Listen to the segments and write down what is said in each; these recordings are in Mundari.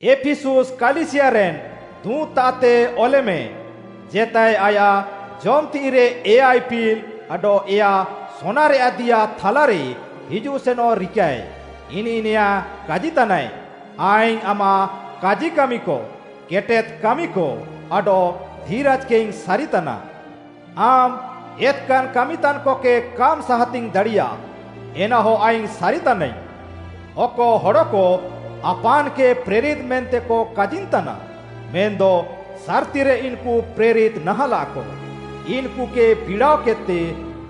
“ଏଫିସୁସ୍‌ କାଲିସିୟାରେନ୍‌ ଦୁଁତ୍‌ତାଃତେ ଅଲେମେ, ଜେତାଏ ଆୟାଃ ଜମ୍‌ ତିଃଇରେ ଏୟା ଇପିଲ୍‌ ଆଡଃ ଏୟା ସୋନାରେୟାଃ ଦିଆ ଥାଲାରେ ହିଜୁଃସେନଃ ରିକାଃଏ, ଇନିଃ ନେଆଁ କାଜିତାନାଏ, ଆଇଙ୍ଗ୍‌ ଆମାଃ କାଜିକାମିକ, କେଟେଦ୍‌ କାମିକ, ଆଡଃ ଧିରାଜ୍‌କେଇଙ୍ଗ୍‌ ସାରିତାନା। ଆମ୍‌ ଏତ୍‌କାନ୍‌ କାମିତାନ୍‌କକେ କାମ୍‌ ସାହାତିଙ୍ଗ୍‌ ଦାଡ଼ିୟା, ଏନାହ ଆଇଙ୍ଗ୍‌ ସାରିତାନାଇଙ୍ଗ୍‌। ଅକ ହଡ଼କ, ଆପାନ୍‌କେ ପ୍ରେରିତ୍‌ ମେନ୍ତେକ କାଜିନ୍‌ତାନା, ମେନ୍‌ଦ ସାର୍‌ତିରେ ଇନ୍‌କୁ ପ୍ରେରିତ୍‌ ନାହାଁଲାକ, ଇନ୍‌କୁକେ ବିଡ଼ାଅକେଦ୍‍ତେ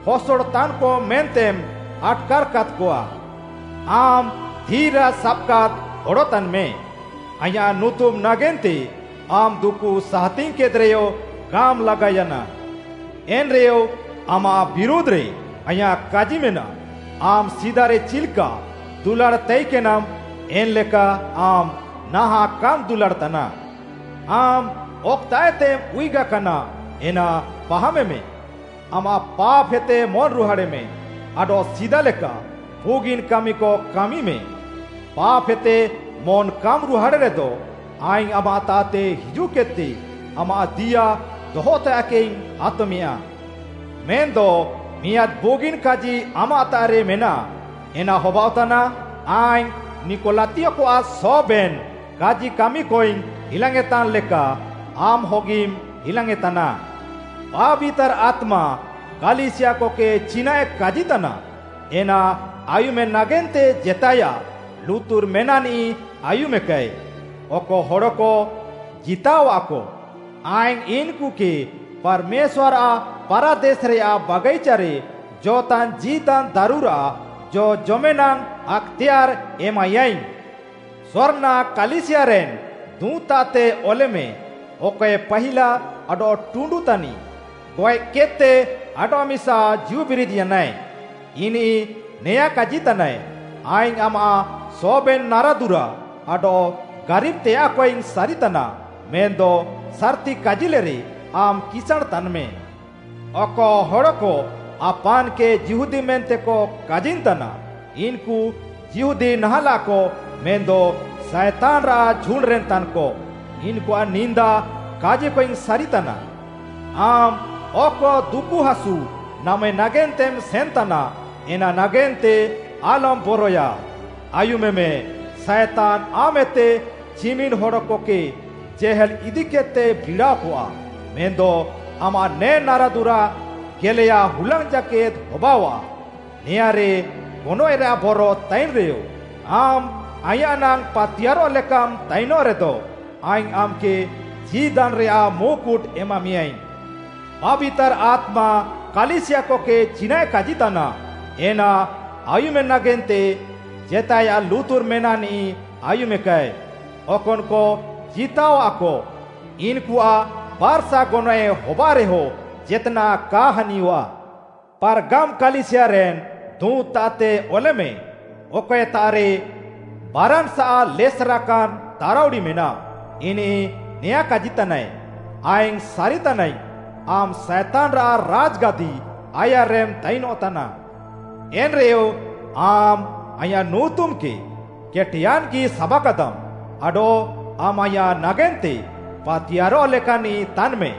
ହସଡ଼ତାନ୍‌କ ମେନ୍ତେମ୍‌ ଆଟ୍‌କାର୍‌କାଦ୍‌କଆ। ଆମ୍‌ ଧିରାଜ୍‌ ସାବାକାଦ୍‌ ହଡ଼ ତାନ୍‌ମେ। ଆଇଁୟାଃ ନୁତୁମ୍‌ ନାଗେନ୍ତେ ଆମ୍‌ ଦୁକୁ ସାହାତିଙ୍ଗ୍‌କେଦ୍‌ରେୟ କାମ୍‌ ଲାଗାୟାନା। ଏନ୍‌ରେୟ ଆମାଃ ବିରୁଧ୍‌ରେ ଆଇଁୟାଃ କାଜି ମେନାଃ, ଆମ୍‌ ସିଦାରେ ଚିଲ୍‌କା ଦୁଲାଡ଼୍‌ ତାଇକେନାମ୍‌, ଏନ୍‌ଲେକା ଆମ୍‌ ନାହାଁଃ କାମ୍‌ ଦୁଲାଡ଼୍‌ ତାନା। ଆମ୍‌ ଅକ୍‌ତାଃଏତେମ୍‌ ଉୟୁଗାକାନା, ଏନା ପାହାମେମେ, ଆମାଃ ପାପ୍‌ହେତେ ମନ୍‌ରୁହାଡ଼େମେ ଆଡଃ ସିଦା ଲେକା ବୁଗିନ୍‌ କାମିକ କାମିମେ। ପାପ୍‌ହେତେ ମନ୍‌ କାମ୍‌ ରୁହାଡ଼େରେଦ, ଆଇଙ୍ଗ୍‌ ଆମାଃତାଃତେ ହିଜୁଃକେଦ୍‌ତେ ଆମାଃ ଦିଆ ଦହତେୟାଃକେଇଙ୍ଗ୍‌ ଆତମେୟାଁ। ମେନ୍‌ଦ ମିଆଁଦ୍‌ ବୁଗିନ୍‌ କାଜି ଆମାଃତାଃରେ ମେନାଃ, ଏନା ହବାଅଃତାନା, ଆଇଙ୍ଗ୍‌ ନିକଲାତୀୟକଆଃ ସବେନ୍‌ କାଜିକାମିକଇଙ୍ଗ୍‌ ହିଲାଙ୍ଗ୍‌ୟେଁତାନ୍‌ ଲେକା ଆମ୍‌ ହଗିମ୍‌ ହିଲାଙ୍ଗ୍‌ୟେଁତାନା। “ପାବିତାର୍‌ ଆତ୍ମା କାଲିସିୟାକକେ ଚିନାଃଏ କାଜିତାନା, ଏନା ଆୟୁମେ ନାଗେନ୍ତେ ଜେତାଏୟାଃ ଲୁତୁର୍ ମେନାଃନିଃ ଆୟୁମେକାଏ। ଅକ ହଡ଼କ ଜିତାଅୱାଃକ, ଆଇଙ୍ଗ୍‌ ଇନ୍‌କୁକେ ପାର୍‌ମେଶ୍ୱାର୍‌ଆଃ ପାରାଦେସ୍‌ରେୟାଃ ବାଗାଇଚାରେ ଜ'ଅଃତାନ୍‌ ଜୀଦାନ୍‌ ଦାରୁରାଃ ଜ ଜମେନାଙ୍ଗ୍‌ ଆକ୍‌ତେୟାର୍‌ ଏମାଇୟାଇଙ୍ଗ୍‌। “ସ୍ମର୍ଣ୍ଣା କାଲିସିୟାରେନ୍‌ ଦୁଁତ୍‌ତାଃତେ ଅଲେମେ, ଅକଏ ପାହିଲା ଆଡଃ ଟୁଣ୍ଡୁ ତାନିଃ, ଗଏଃକେଦ୍‌ତେ ଆଡଃମିସା ଜୀଉବିରିଦ୍‌ୟାନାଏ, ଇନିଃ ନେଆଁ କାଜିତାନାଏ, ଆଇଙ୍ଗ୍‌ ଆମାଃ ସବେନ୍‌ ନାରାଦୁରା ଆଡଃ ଗାରିବ୍‌ତେୟାଃକଇଙ୍ଗ୍‌ ସାରିତାନା, ମେନ୍‌ଦ ସାର୍‌ତି କାଜିଲେରେ ଆମ୍‌ କିସାଁଣ୍‌ ତାନ୍‌ମେ। ଅକ ହଡ଼କ ଆପାନ୍‌କେ ଯିହୁଦୀ ମେନ୍ତେକ କାଜିନ୍‌ତାନା, ଇନ୍‌କୁ ଯିହୁଦୀ ନାହାଁଲାକ ମେନ୍‌ଦ ସାଏତାନ୍‌ରାଃ ଝୁଣ୍ଡ୍‌ରେନ୍‌ ତାନ୍‌କ, ଇନ୍‌କୁଆଃ ନିନ୍ଦା କାଜିିକଇଙ୍ଗ୍‌ ସାରିତାନା। ଆମ୍‌ ଅକ ଦୁକୁହାସୁ ନାମେ ନାଗେନ୍ତେମ୍‌ ସେନ୍‌ତାନା, ଏନା ନାଗେନ୍ତେ ଆଲମ୍‌ ବରଏୟା। ଆୟୁମେମେ, ସାଏତାନ୍‌ ଆମାଃଏତେ ଚିମିନ୍‌ ହଡ଼କକେ ଜେହେଲ୍‌ ଇଦିକେଦ୍‌ତେ ବିଡ଼ାଅକଆ। ମେନ୍‌ଦ ଆମାଃ ନେ ନାରାଦୁରା ଗେଲେୟା ହୁଲାଙ୍ଗ୍‌ ଜାକେଦ୍‌ ହବାଅଃଆ। ନେଆଁରେ ଗନଏଃରାଃ ବର ତାଇନ୍‌ରେୟ ଆମ୍‌ ଆଇଁୟାଃ ନାଙ୍ଗ୍‌ ପାତିୟାର୍‌ରଃ ଲେକାମ୍‌ ତାଇନଃ ରେଦ, ଆଇଙ୍ଗ୍‌ ଆମ୍‌କେ ଜୀଦାନ୍‌ରେୟାଃ ମୁକୁଟ୍‌ ଏମାମେୟାଁଇଙ୍ଗ୍‌। “ପାବିତାର୍‌ ଆତ୍ମା କାଲିସିୟାକକେ ଚିନାଃଏ କାଜିତାନା, ଏନା ଆୟୁମେ ନାଗେନ୍ତେ ଜେତାଏୟାଃ ଲୁତୁର୍ ମେନାଃନିଃ ଆୟୁମେକାଏ। ଅକନ୍‌କ ଜିତାଅୱାଃକ, ଇନ୍‌କୁଆଃ ବାର୍‌ସା ଗନଏଃ ହବାଅଃରେୟ ଜେତ୍‌ନାଃ କା ହାନିୟଃଆ। “ପାର୍ଗାମ୍‌ କାଲିସିୟାରେନ୍ ଦୁଁତ୍‌ତାଃତେ ଅଲେମେ, ଅକଏତାଃରେ ବାରାନ୍‌ସାଃ ଲେସେରାକାନ୍‌ ତାରାଉଡ଼ି ମେନାଃ, ଇନିଃ ନେଆଁ କାଜିତାନାଏ, ଆଇଙ୍ଗ୍‌ ସାରିତାନାଇଙ୍ଗ୍‌, ଆମ୍‌ ସାଏତାନ୍‌ରାଃ ରାଜ୍‌ଗାଦି ଆୟାର୍‌ରେମ୍‌ ତାଇନଃତାନା। ଏନ୍‌ରେୟ ଆମ୍‌ ଆଇଁୟାଃ ନୁତୁମ୍‌କେ କେଟେୟାନ୍‌ଗି ସାବାକାଦାମ୍‌, ଆଡଃ ଆମ୍‌ ଆଇଁୟାଃ ନାଗେନ୍ତେ ପାତିୟାର୍‌ରଃ ଲେକାନ୍‌ନିଃ ତାନ୍‌ମେ।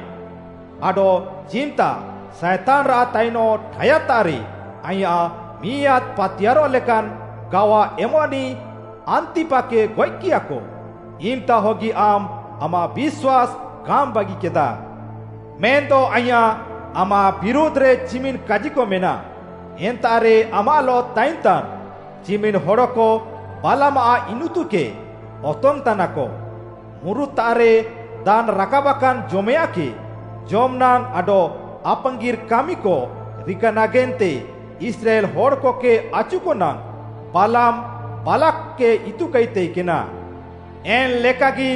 ଆଡଃ ଚିମ୍‌ତା ସାଏତାନ୍‌ରାଃ ତାଇନଃ ଠାୟାଦ୍‌ତାଃରେ ଆଇଁୟାଃ ମିଆଁଦ୍‌ ପାତିୟାର୍‌ରଃ ଲେକାନ୍‌ ଗାୱା ଏମ୍‌ନିଃ ଆନ୍ତିପାକେ ଗଏଃକିୟାକ, ଇମ୍‌ତାହଗି ଆମ୍‌ ଆମାଃ ବିଶ୍ୱାସ୍‌ କାମ୍‌ ବାଗିକେଦା। ମେନ୍‌ଦ ଆଇଁୟାଃ, ଆମାଃ ବିରୁଧ୍‌ରେ ଚିମିନ୍‌ କାଜିକ ମେନାଃ। ଏନ୍ତାଃରେ ଆମାଃଲଃ ତାଇନ୍‌ତାନ୍ ଚିମିନ୍‌ ହଡ଼କ ବାଲାମ୍‌ଆଃ ଇନିତୁକେ ଅତଙ୍ଗ୍‌ତାନାକ। ମୁରୁତ୍‌ତାଃରେ ଦାନ୍‌ ରାକାବାକାନ୍‌ ଜମେୟାଁଃକେ ଜମ୍‌ନାଙ୍ଗ୍‌ ଆଡଃ ଆପାଙ୍ଗିର୍‌ କାମିକ ରିକା ନାଗେନ୍ତେ ଇସ୍ରାଏଲ୍‌ ହଡ଼କକେ ଆଚୁକ ନାଙ୍ଗ୍‌, ବାଲାମ୍‌, ବାଲାକ୍‌କେ ଇତୁକାଇ ତାଇକେନା। ଏନ୍‍ଲେକାଗି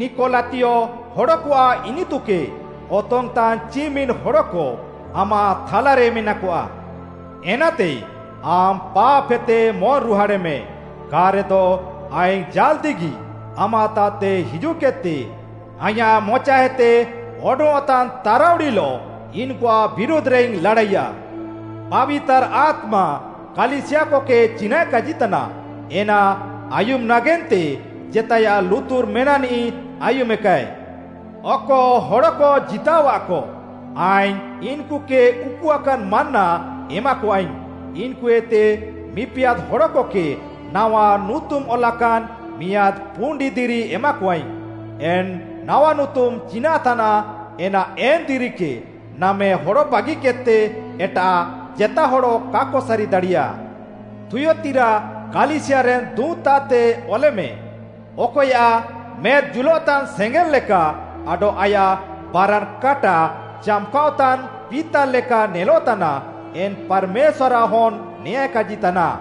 ନିକଲାତୀୟ ହଡ଼କଆଃ ଇନିତୁକେ ଅତଙ୍ଗ୍‌ତାନ୍‌ ଚିମିନ୍‌ ହଡ଼କ ଆମାଃ ଥାଲାରେ ମେନାକଆ। ଏନାତେ ଆମ୍‌ ପାପ୍‌ହେତେ ମନ୍‌ରୁହାଡ଼େମେ, କା'ରେଦ ଆଇଙ୍ଗ୍‌ ଜାଲ୍‌ଦିଗି ଆମାଃତାଃତେ ହିଜୁଃକେଦ୍‌ତେ ଆଇଁୟାଃ ମଚାଏତେ ଅଡଙ୍ଗ୍‌ଅଃତାନ୍‌ ତାରାଉଡ଼ିଲଃ ଇନ୍‌କୁଆଃ ବିରୁଧ୍‌ରେଇଙ୍ଗ୍‌ ଲାଡ଼ାଇୟା। “ପାବିତାର୍‌ ଆତ୍ମା କାଲିସିୟାକକେ ଚିନାଃଏ କାଜିତାନା, ଏନା ଆୟୁମେ ନାଗେନ୍ତେ ଜେତାଏୟାଃ ଲୁତୁର୍ ମେନାଃନିଃ ଆୟୁମେକାଏ। ଅକ ହଡ଼କ ଜିତାଅୱାଃକ, ଆଇଙ୍ଗ୍‌ ଇନ୍‌କୁକେ ଉକୁଆକାନ୍‌ ମାନ୍ନା ଏମାକଆଇଙ୍ଗ୍‌, ଇନ୍‌କୁଏତେ ମିପିଆଦ୍‌ ହଡ଼କକେ ନାୱା ନୁତୁମ୍‌ ଅଲାକାନ୍‌ ମିଆଁଦ୍‌ ପୁଣ୍ଡି ଦିରି ଏମାକଆଇଙ୍ଗ୍‌। ଏନ୍‌ ନାୱା ନୁତୁମ୍‌ ଚିନାଃ ତାନାଃ, ଏନା ଏନ୍‌ ଦିରିକେ ନାମେ ହଡ଼ ବାଗିକେଦ୍‌ତେ ଏଟାଃ ଜେତା ହଡ଼ କାକ ସାରି ଦାଡ଼ିୟା। “ଥୁୟତିରା କାଲିସିୟାରେନ୍‌ ଦୁଁତ୍‌ତାଃତେ ଅଲେମେ, ଅକଏୟାଃ ମେଦ୍‌ ଜୁଲଃତାନ୍‌ ସେଙ୍ଗେଲ୍‌ ଲେକା ଆଡଃ ଆୟାଃ ବାରାନ୍‌ କାଟା ଚାମ୍‌କାଅଃତାନ୍‌ ପିତାଲ୍‌ ଲେକା ନେଲଃତାନା, ଏନ୍‌ ପାର୍‌ମେଶ୍ୱାର୍‌ଆଃ ହନ୍‌, ନେଆଁଏ କାଜିତାନା,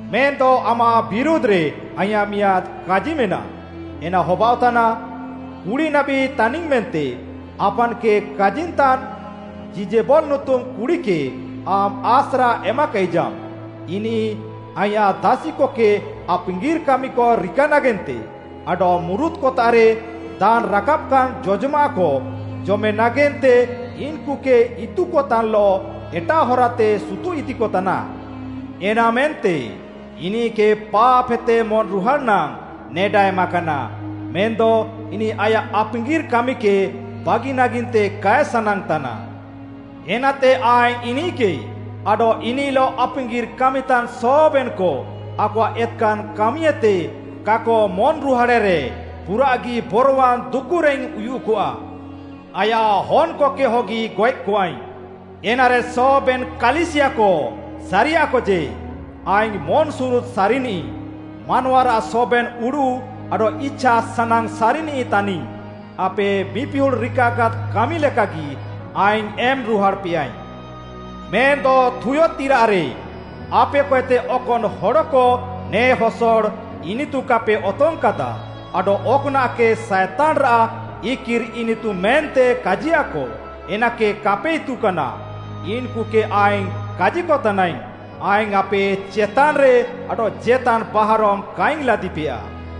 ମେନ୍‌ଦ ଆମାଃ ବିରୁଧ୍‌ରେ ଆଇଁୟାଃ ମିଆଁଦ୍‌ କାଜି ମେନାଃ, ଏନା ହବାଅଃତାନା, କୁଡ଼ିନାବୀ ତାନିଙ୍ଗ୍‌ ମେନ୍ତେ ଆପାନ୍‌କେ କାଜିନ୍‌ତାନ୍‌ ଯିଜେବଲ୍‌ ନୁତୁମ୍‌ କୁଡ଼ିକେ ଆମ୍‌ ଆସ୍ରା ଏମାକାଇଜାମ୍‌। ଇନିଃ ଆଇଁୟାଃ ଦାସିକକେ ଆପାଙ୍ଗିର୍‌ କାମିକ ରିକା ନାଗେନ୍ତେ ଆଡଃ ମୁରୁତ୍‌କତାଃରେ ଦାନ୍‌ ରାକାବାକାନ୍‌ ଜଜମାଃକ ଜମେ ନାଗେନ୍ତେ ଇନ୍‌କୁକେ ଇତୁତାନ୍‌ଲଃ ଏଟାଃ ହରାତେ ସୁତୁଃଇଦିକତାନା। ଏନାମେନ୍ତେ ଇନିଃକେ ପାପ୍‌ହେତେ ମନ୍‌ରୁହାଡ଼୍‌ ନାଙ୍ଗ୍‌ ନେଡା ଏମାକାନା, ମେନ୍‌ଦ ଇନିଃ ଆୟାଃ ଆପାଙ୍ଗିର୍‌ କାମିକେ ବାଗି ନାଗେନ୍ତେ କାଏ ସାନାଙ୍ଗ୍‌ତାନା। ଏନାତେ ଆଇଙ୍ଗ୍‌ ଇନିଃକେ ଆଡଃ ଇନିଃଲଃ ଆପାଙ୍ଗିର୍‌ କାମିତାନ୍‌ ସବେନ୍‌କ ଆକଆଃ ଏତ୍‌କାନ୍‌ କାମିଏତେ କାକ ମନ୍‌ରୁହାଡ଼େରେ, ପୁରାଃଗି ବରୱାନ୍‌ ଦୁକୁରେଇଙ୍ଗ୍‌ ଉୟୁଃକଆ। ଆୟାଃ ହନ୍‌କକେ ହଗି ଗଏଃକଆଇଙ୍ଗ୍‌। ଏନାରେ ସବେନ୍‌ କାଲିସିୟାକ ସାରିୟାକ ଯେ, ଆଇଙ୍ଗ୍‌ ମନ୍‌ସୁରୁଦ୍‌ ସାରିନିଃ, ମାନୱାରାଃ ସବେନ୍‌ ଉଡ଼ୁଃ ଆଡଃ ଇଛାସାନାଙ୍ଗ୍‌ ସାରିନିଃ ତାନିଙ୍ଗ୍‌। ଆପେ ମିପିହୁଡ଼୍‌ ରିକାକାଦ୍‌ କାମି ଲେକାଗି ଆଇଙ୍ଗ୍‌ ଏମ୍‌ ରୁହାଡ଼୍‌ପେୟାଇଙ୍ଗ୍‌। “ମେନ୍‍ଦ ଥୁୟତିରାରେ ଆପେକଏତେ ଅକନ୍‌ ହଡ଼କ ନେ ହସଡ଼ ଇନିତୁ କାପେ ଅତଙ୍ଗ୍‌କାଦା ଆଡଃ ଅକ୍‌ନାଃକେ ସାଏତାନ୍‌ରାଃ ଇକିର୍‌ ଇନିତୁ ମେନ୍ତେ କାଜିୟାଃକ, ଏନାକେ କାପେ ଇତୁକାନା, ଇନ୍‌କୁକେ ଆଇଙ୍ଗ୍‌ କାଜିକତାନାଇଙ୍ଗ୍‌, ଆଇଙ୍ଗ୍‌ ଆପେ ଚେତାନ୍‌ରେ ଆଡଃ ଜେତାନ୍‌ ବାହାରମ୍‌ କାଇଙ୍ଗ୍‌ ଲାଦିପେୟା।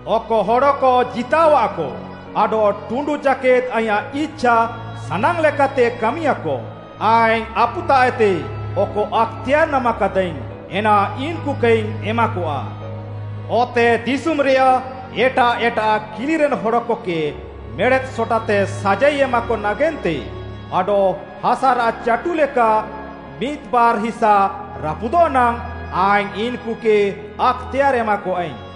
ଅକ ହଡ଼କ ଜିତାଅୱାଃକ, ଆଡଃ ଟୁଣ୍ଡୁ ଜାକେଦ୍‌ ଆଇଁୟାଃ ଇଛାସାନାଙ୍ଗ୍‌ ଲେକାତେ କାମିୟାଁକ, ଆଇଙ୍ଗ୍‌ ଆପୁତାଃଏତେ ଅକ ଆକ୍‌ତେୟାର୍‌ ନାମାକାଦାଇଙ୍ଗ୍‌, ଏନା ଇନ୍‌କୁକେଇଙ୍ଗ୍‌ ଏମାକଆ। ଅତେଦିଶୁମ୍‌ରେୟାଃ ଏଟାଃ ଏଟାଃ କିଲିରେନ୍‌ ହଡ଼କକେ ମେଡ଼େଦ୍‌ ସଟାତେ ସାଜାଇ ଏମାକ ନାଗେନ୍ତେ ଆଡଃ ହାସାରାଃ ଚାଟୁ ଲେକା ମିଦ୍‌ ବାର୍‌ ହିସା ରାପୁଦଃ ନାଙ୍ଗ୍‌, ଆଇଙ୍ଗ୍‌ ଇନ୍‌କୁକେ ଆକ୍‌ତେୟାର୍‌ ଏମାକଆଇଙ୍ଗ୍‌।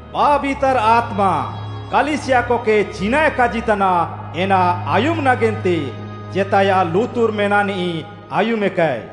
“ପାବିତାର୍‌ ଆତ୍ମା କାଲିସିୟାକକେ ଚିନାଃଏ କାଜିତାନା, ଏନା ଆୟୁମେ ନାଗେନ୍ତେ ଜେତାଏୟାଃ ଲୁତୁର୍ ମେନାଃନିଃ ଆୟୁମେକାଏ।